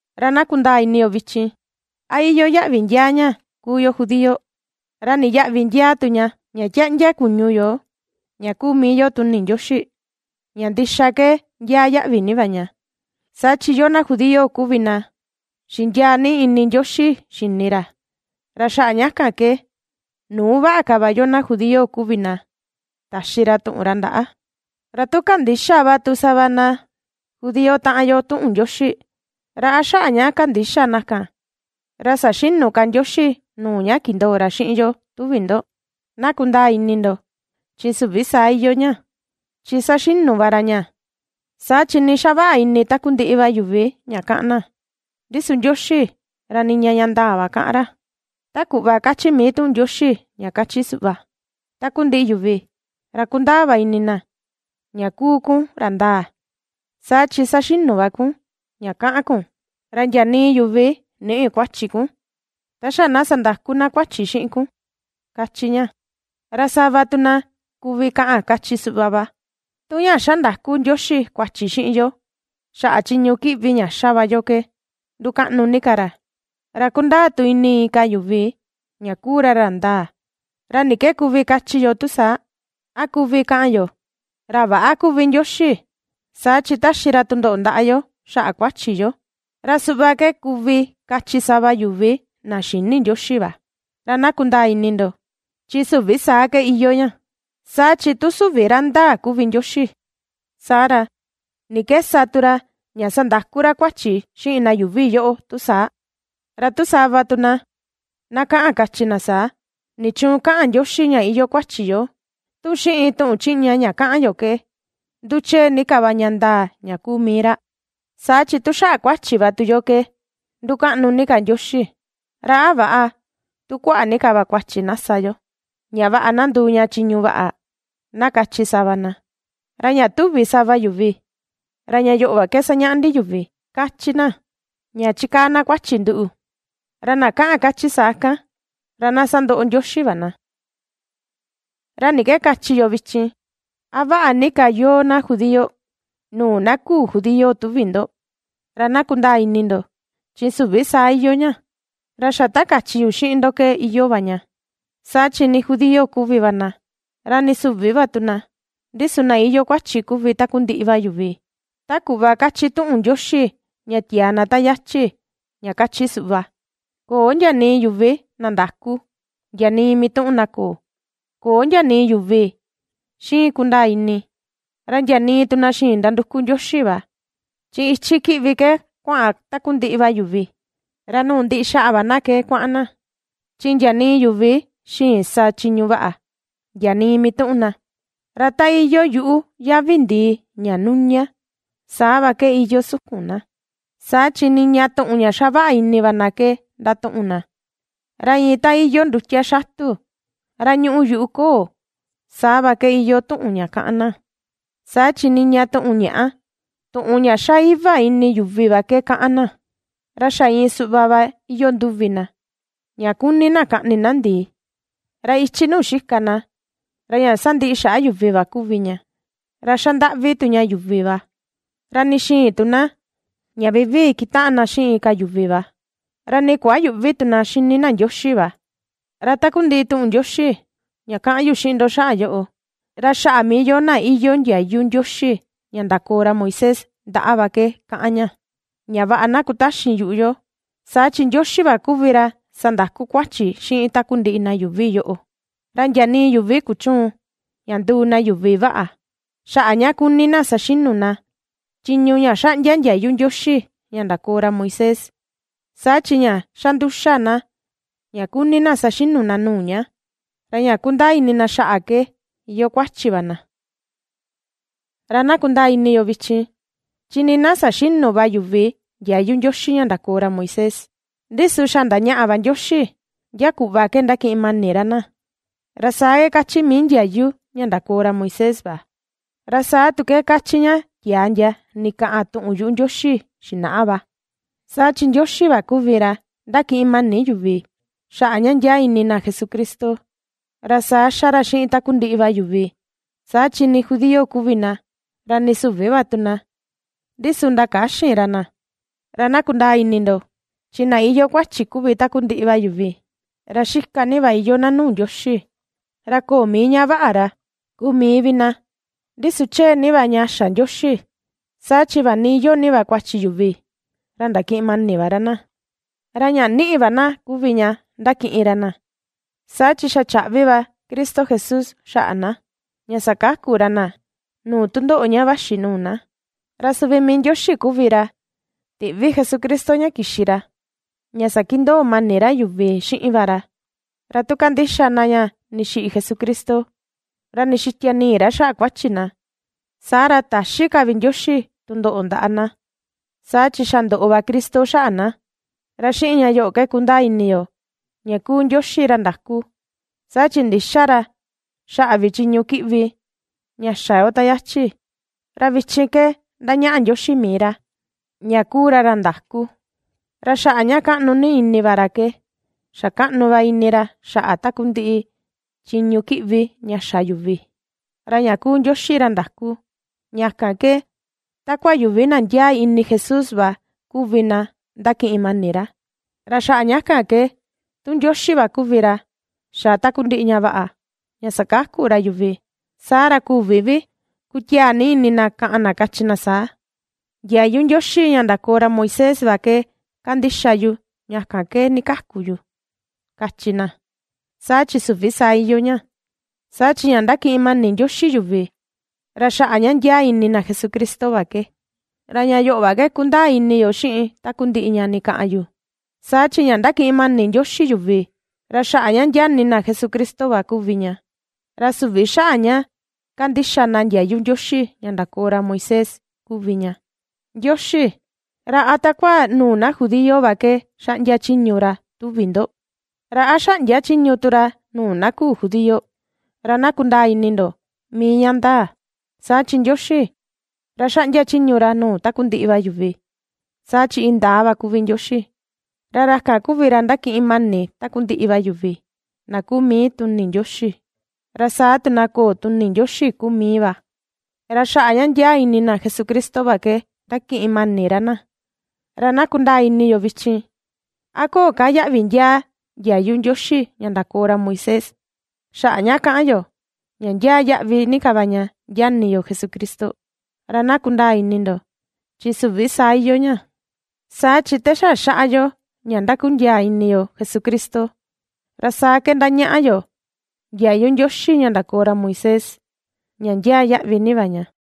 Ra na kundaa ini yo vichin, ¿a iyoo yaꞌvi ndiaa ña kuu yo judío? ¿Ra ni yaꞌvi ndiaa tu ña, ña ^tiáꞌndiá kuñu yo, ña kuu mii yo tuni Ndioxi? Ña ndixa ke ndiaa yaꞌvi ni va ña, saa chi yoo na judío kuvi na xindiaa ni ini Ndioxi xini ra, ra xaꞌa ña kan ke nuu vaꞌa ka va yoo na judío kuvi na, taxi ra tuꞌun ra ndaꞌa. Ra tu kandïxa va tu sava na judío taꞌan yo tuꞌun Ndioxi, ¿ra a xaꞌa ña kandïxa na kan, ra saxïnu ka Ndioxi nuu ña kindoo ra xiꞌin yo, tuvi ndo? Na kundaa ini ndo, ¡chi süvi saa iyoo ña! Chi saxinu va ra ña, saa chi nii xavaꞌa ini takundiꞌi va yuvi ña kaꞌan na, ndi su Ndioxi ra niña ña ndaa va kaꞌan ra; ta kuꞌva kachi mii tuꞌun Ndioxi ña kachi suꞌva: Takundiꞌi yuvi, ra ^kundaa va ini na ña kuu kun ra ndaa, saa chi saxinu va kun, ña kaꞌan kun; ra ndia nii yuvi nïꞌi kuachi kun, ta xa na sandakú na kuachi xiꞌin kun, kachi ña. Ra sava tu na kuvi kaꞌan kachi suꞌva va: “Tu ña ^xa ndaku Ndioxi kuachi xiꞌin yo xaꞌa chiñu kiꞌvi ña ^xa va yo ke ndukaꞌnu ni ka ra, ra kundaa tu ini inka yuvi ña kuu ra ra ndaa, ¿ra ni ke kuvi kachi yo tu saa?, a kuvi kaꞌan yo, ¿ra väꞌa kuvi Ndioxi saa chi taxi ra tundoꞌo ndaꞌa yo xaꞌa kuachi yo?” (Ra suꞌva ke kuvi kachi sava yuvi na xïni Ndioxi va.) Ra na kundaa ini ndo, ¡chi süvi saa ke iyoo ña! Saa chi tu süvi ra ndaa kuvi Ndioxi, saa ra, ¿ni ke sa tu ra, ña sandaku ra kuachi xiꞌin na yuuvi yoꞌo, tu saa? Ra tu sava tu na, na kaꞌan kachi na saa: “¿Nichuun kaꞌan Ndioxi ña iyoo kuachi yo, tu xiꞌin tuꞌun chiꞌña ña kaꞌan yo ke nduchee ni ka va ña ndaa ña kuu mii ra? Saa chi tu xaꞌa kuachi va tu yo ke ndukaꞌnu ni ka Ndioxi, ¿ra a väꞌa, tu kuaꞌa ni ka va kuachi na sa yo, ña vaꞌa na nduu ña chiñu vaꞌa?”, na kachi sava na. Ra ña tuvi sava yuvi, ra ña yoꞌo va ke sañaꞌa ndi yuvi, ^kachi na, ña chikaa na kuachi nduꞌu. Ra na kaꞌan kachi saa kan, ra na sandoꞌo Ndioxi va na. ¿Ra ni ke kachi yo vichin? ¿A vaꞌa ni ka yoo na judío, nuu na küu judío tuvi ndo? Ra na kundaa ini ndo, ¡chi süvi saa iyoo ña! Ra xa ta kachi yu xiꞌin ndo ke iyoo va ña, saa chi nii judío kuvi va na, ra nii süvi va tu na, ndi su na iyoo kuachi kuvi takundiꞌi va yuvi. Ta kuꞌva kachi tuꞌun Ndioxi ña tiaa na ta yachi, ña kachi suꞌva: Köo ndia nii yuvi na ndakú, ndia nii mituꞌun na köo. Köo ndia nii yuvi ^xiin kundaa ini, ra ndia nii tu na xïin nanduku Ndioxi va. Chi ichi kiꞌvi ke kuaꞌan takundiꞌi va yuvi, ra nuu ndiꞌi xaꞌa va na ke kuaꞌan na. Chi ndia nii yuvi xïin ^sa chiñu vaꞌa, ndia nii mituꞌun na. Ra ta iyoo yuꞌu yavi ndii ña nuña, saa va ke iyoo sukun na; Saa chi niña tuꞌun ña xavaꞌa ini va na ke ndatuꞌun na; ra iin ta iyoo ndutia xatu ra ñuꞌu yuꞌu koo, saa va ke iyoo tuꞌun ña kaꞌan na. Saa chi niña tuꞌun ñaꞌá, tuꞌun ña ^xa iva ini yuvi va ke kaꞌan na. Ra xa iin suꞌva va iyoo nduvi na, ña kuni na kaꞌni na ndii. Ra ichi nuu xika na, ra ña sandiꞌi xaꞌa yuvi va kuvi ña, ra xa ndaꞌvi tu ña yuvi va. Ra nii xïin tu na, ña vivii kutaꞌan na xiꞌin inka yuvi va. Ra nii kuayüꞌvi tu na ^xini na Ndioxi va. Ra takundiꞌi tuꞌun Ndioxi ña kaꞌan yu xiꞌin ndo xaꞌa yoꞌo, ra xaꞌa mii yoo na iyoo ndiayu Ndioxi ña ndakoo ra Moisés ndaꞌa va ke kaꞌan ña. Ña vaꞌa na kutaxin yuꞌu yo, saa chi Ndioxi va kuvi ra sandaku kuachi xiꞌin takundiꞌi na yuuvi yoꞌo. Ra ndia nii yuvi kuchüun ña nduu na yuvi vaꞌa, xaꞌa ña kuni na saxinu na chiñu ña xaꞌndia ndiayu Ndioxi ña ndakoo ra Moisés, saa chi ña xa nduxa na ña kuni na saxinu na nuu ña, ra ña kundaa ini na xaꞌa ke iyoo kuachi va na. Ra na kundaa ini yo vichin, chi nii na saxïnu va yuvi ndiayu Ndioxi ña ndakoo ra Moisés, ndi su xa ndañaꞌa va Ndioxi ndia kuꞌva ke ndakiꞌin mani ra na, Ra saa ke kachi mii ndiayu ra ña ndakoo ra Moisés va, ra saa tu ke kachi ña tiaa ndia ndikaꞌan tuꞌun yuꞌu Ndioxi xinaꞌa va. Saa chi Ndioxi va kuvi ra ^ndakiꞌin mani yuvi, xaꞌa ña ndiaa ini na Jesucristo, ra saa ^xa ra xiꞌin takundiꞌi va yuvi, saa chi nii judío kuvi na, ra nii süvi va tu na, ndi su ndakäxin ra na. Ra na kundaa ini ndo, chi na iyoo kuachi kuvi takundiꞌi va yuvi, ra xika ni va iyoo na nuu Ndioxi, ra köo mii ña vaꞌa ra, kuu mii vi na. Ndi su chee ni va ña xa Ndioxi, saa chi vaꞌa ni iyoo ni va kuachi yuvi, ra ndakiꞌin mani va ra na, ra ña niꞌi va na kuvi ña ndakiꞌin ra na, saa chi xa chaꞌvi va Cristo Jesús xaꞌa na, ña sakaku ra na nuu tundoꞌo ña vaxi nuu na. Ra suvi mii Ndioxi kuvi ra tiꞌvi Jesucristo ña kixi ra ña sakindoo mani ra yuvi xiꞌin va ra. Ra tu kandixa na ña ndixiꞌi Jesucristo, ra ndixitia nii ra xaꞌa kuachi na, saa ra täxi ka vi Ndioxi tundoꞌo ndaꞌa na, saa chi xa ndoꞌo va Cristo xaꞌa na. Ra xiꞌin ña yoꞌo ke kundaa ini yo, ña kuu Ndioxi ra ndaku, saa chi ndïxa ra xaꞌa vi chiñu kiꞌvi ña xa yo ta yachi. Ra vichin ke ndañaꞌa Ndioxi mii ra ña kuu ra ra ndaku, ra xaꞌa ña kaꞌnu ni ini va ra ke xa kaꞌnu va ini ra xaꞌa takundiꞌi chiñu kiꞌvi ña xa yuvi. Ra ña kuu Ndioxi ra ndaku, ña kan ke takua yuvi na ndiaa ini Jesús va kuvi na ndakiꞌin mani ra. Ra xaꞌa ña kan ke, tu Ndioxi va kuvi ra xa takundiꞌi ña vaꞌa ña sakaku ra yuvi, saa ra, küvi vi kutiaa ni ini na kaꞌan na kachi na saa: “Ndiayu Ndioxi ña ndakoo ra Moisés va ke kandixa yu ña kan ke ndikaku yu”, kachi na. Saa chi süvi saa iyoo ña, saa chi ña ndakiꞌin mani Ndioxi yuvi, ra xaꞌa ña ndiaa ini na Jesucristo va ke. Ra ña yoꞌo va ke ^kundaa ini yo xiꞌin takundiꞌi ña ndikaꞌan yu, saa chi ña ndakiꞌin mani Ndioxi yuvi ra xaꞌa ña ndiaa ini na Jesucristo va kuvi ña, ra süvi xaꞌa ña kandixa na ndiayu Ndioxi ña ndakoo ra Moisés kuvi ña. Ndioxi, ¿ra a takua nuu na judío va ke xaꞌndia chiñu ra tuvi ndo? ¿Ra a xäꞌndia chiñu tu ra, nuu na küu judío? Ra na kundaa ini ndo mii ña ndaa, saa chi Ndioxi, ra xaꞌndia chiñu ra nuu takundiꞌi va yuvi. Saa chi indaa va kuvi Ndioxi, ra ra kan kuvi ra ndakiꞌin mani takundiꞌi va yuvi na kuu mii tuni Ndioxi, ra saa tu na köo tuni Ndioxi kuu mii va; ra xaꞌa ña ndiaa ini na Jesucristo va ke ndakiꞌin mani ra na. Ra na kundaa ini yo vichin, ¿a köo ka yaꞌvi ndiaa ndiayu Ndioxi ña ndakoo ra Moisés, xaꞌa ña kaꞌan yo ña ndiaa yaꞌvi ni ka va ña ndiaa ini yo Jesucristo? Ra na kundaa ini ndo, chi ¡süvi saa iyoo ña! Saa chi te xa xaꞌa yo ña ndakundiaa ini yo Jesucristo, ra saa ke ndañaꞌa yo ndiayu Ndioxi ña ndakoo ra Moisés, ña ndiaa yaꞌvi ni va ña.